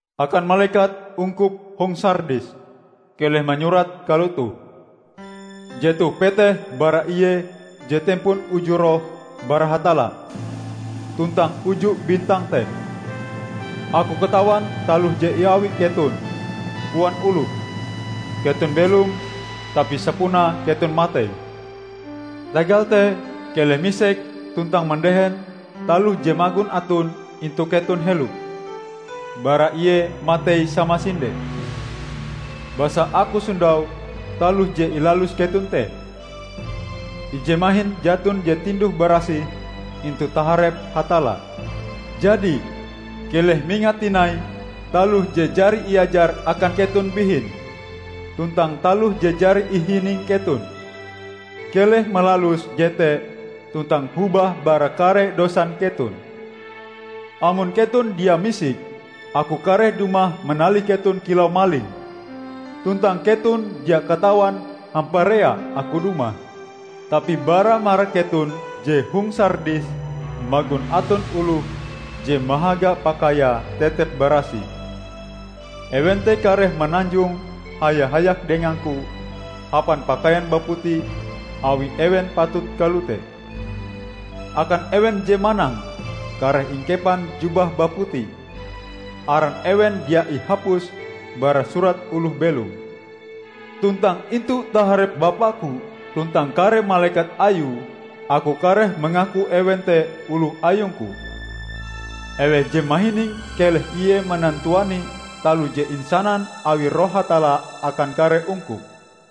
"Akan malekat ungkup hong Sardis, keleh manyurat kalotoh: Jetoh peteh bara Ie je tempon uju roh bara Hatalla tuntang uju bintang te. Aku katawan taloh je iawi keton. Koan oloh, keton belom, tapi sapunae keton matei! Tagal te, keleh misik, tuntang mandehen taloh je magon aton intu keton helo bara ie matei samasinde. Basa Aku sondau taloh je ilalus keton te, ije mahin jaton je tinduh-barasih intu taharep Hatalla. Jadi, keleh mingat tinai taloh je jari iajar akan keton bihin tuntang taloh je jari ihining keton. Keleh malalus jete tuntang hobah bara kare dosan keton. Amon keton dia misik, Aku kareh dumah manalih keton kilau maling; tuntang keton dia katawan hamparea Aku dumah. Tapi bara marak keton je hong Sardis magon aton oloh je mahaga pakaiae tetep barasih. Ewen te kareh mananjong haya-hayak dengang-Ku hapan pakaian baputi, awi ewen patut kalote. Akan ewen je manang kareh ingkepan jubah baputi. Aran ewen dia ingabus bara Surat Oloh Belom. Tuntang intu taharep Bapa-Ku tuntang kare malekat Ayue Aku kareh mangaku ewen te oloh Ayungku. Eweh je mahining keleh ie manantuani taloh je insanan awi Roh Hatalla akan kare ungkup!"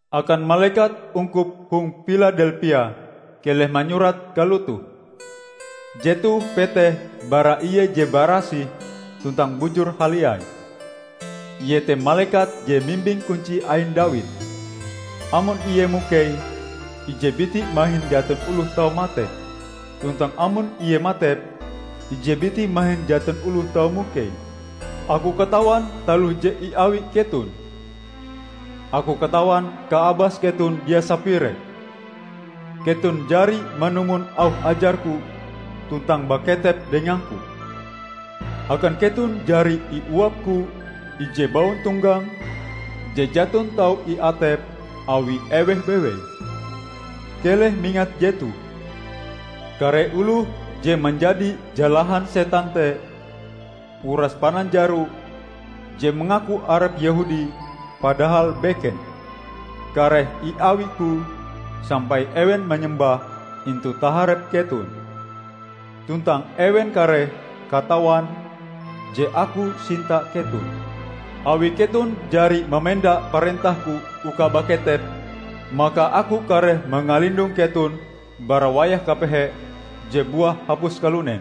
"Akan malekat ungkup hong Piladelpia, keleh manyurat kalotoh: Jetoh peteh bara Ie je barasih tuntang bujur haliai. Ie te malekat je mimbing kunci ain Dawid; amon Ie mukeie, ije biti mahin jaton oloh tau matepe, tuntang amon Ie matepe, ije biti mahin jaton oloh tau mukeie. Aku katawan taloh je iawi keton. Aku katawan kaabas keton dia sapire; keton jari manumon auh ajar-Ku tuntang baketep dengang-Ku. Akan keton jari iuap-Ku ije bauntonggang, je jaton tau iatep awi eweh bewei. Keleh mingat jetoh: Kare oloh je manjadi jalahan setan te, uras pananjaro je mangaku arepe Yehudi padahal beken, kareh iawi-Ku sampai ewen manyembah intu taharep keton. Tuntang ewen kareh katawan je Aku sinta keton. Awi keton jari mamenda parentah-Ku uka baketep, maka Aku kareh mangalindong keton bara wayah kapehe je buah hapus kalunen.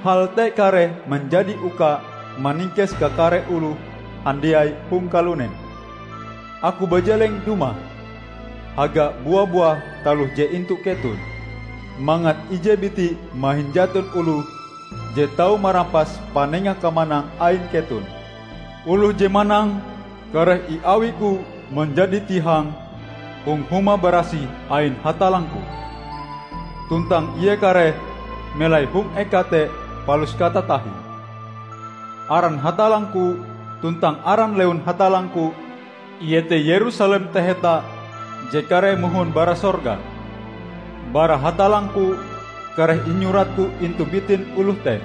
Hal te kareh manjadi uka maningkes kakare oloh handiai hong kalunen. Aku bajeleng dumah! Haga bua-buah taloh je intu keton, mangat ije biti mahin jaton oloh je tau marampas panenga kamanang ain keton. Oloh je manang, kareh iawi-Ku manjadi tihang hong huma barasih ain Hatallang-Ku, tuntang ie kareh melai hong eka te palus katatahie. Aran Hatallang-Ku, tuntang aran lewun Hatallang-Ku -- iete Yerusalem taheta je kareh mohon bara sorga, bara Hatallang-Ku -- kareh inyuratku intu bitin oloh te.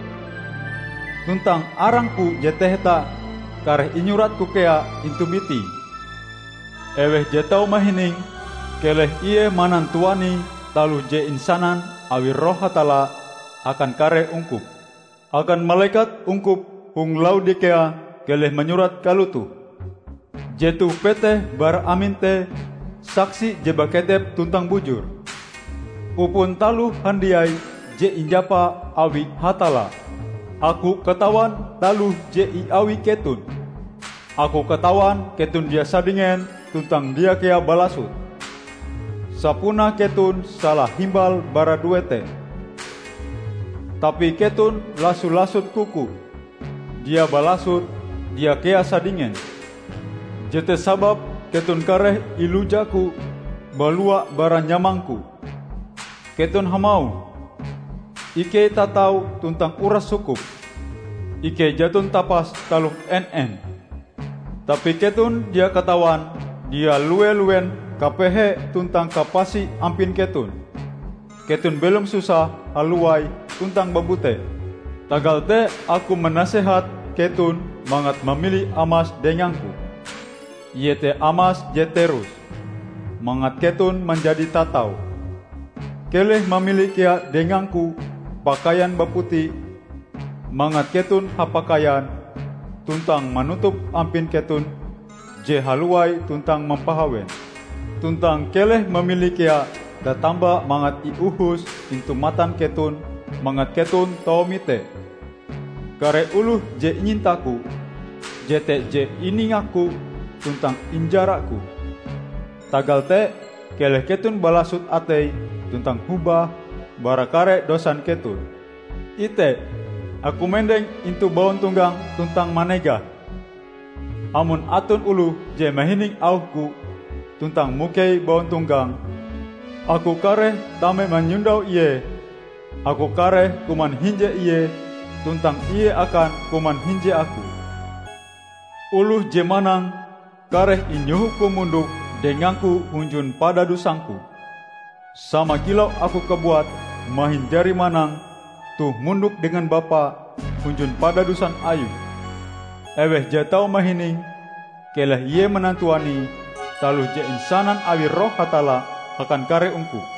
Tuntang arang-Ku je taheta kareh inyurat-Ku kea intu bitie. Eweh je tau mahining, keleh ie manantuani taloh je insanan awi Roh Hatalla akan kare ungkup!" "Akan malekat ungkup hong Laodikea, keleh manyurat kalotoh: Jetoh peteh bara Amen te, Saksi je baketep tuntang bujur, upon taloh handiai je injapa awi Hatalla. Aku katawan taloh je iawi keton; Aku katawan keton dia sadingen tuntang dia kea balasot. Sapunae keton salahimbal bara due te! Tapi keton laso-lasot kuku; dia balasot, dia kea sadinEks. Jete sababe keton kareh ilujaku balua bara nyamang-Ku. Keton hamauh, 'Ikei tatau tuntang uras sukup; ikei jaton tapas taloh en-en.' Tapi keton dia katawan dia lue-luen kapehe tuntang kapasi ampin keton! Keton belom susah, halowai tuntang babute. Tagal te Aku manasehat keton mangat mamili amas dengang-Ku, iete amas je terus, mangat keton manjadi tatau. Keleh mamili kea dengang-Ku pakaian baputi mangat keton hapakaian tuntang manutup ampin keton je halowai tuntang mampahawen. Tuntang keleh mamili kea tatamba mangat iohos intu matan keton mangat keton tau mite. Kare oloh je inyinta-Ku, jete je iningak-Ku tuntang injara-Ku. Tagal te, keleh keton balasot atei tuntang hobah bara kare dosan keton. Ite! Aku mendeng intu bauntonggang tuntang manegah. Amon aton oloh je mahining auh-Ku, tuntang mukei bauntonggang, Aku kareh tame manyondau ie; Aku kareh kuman hinje ie tuntang ie akan kuman hinje Aku. Oloh je manang, kareh inyoho-Ku mondok dengang-Ku hunjun padadusang-Ku, sama kilau Aku kabuat mahin jari manang toh mondok dengan Bapa hunjun padadusan Ayue. Eweh je tau mahining, keleh ie manantuani taloh je insanan awi Roh Hatalla akan kare ungkup!"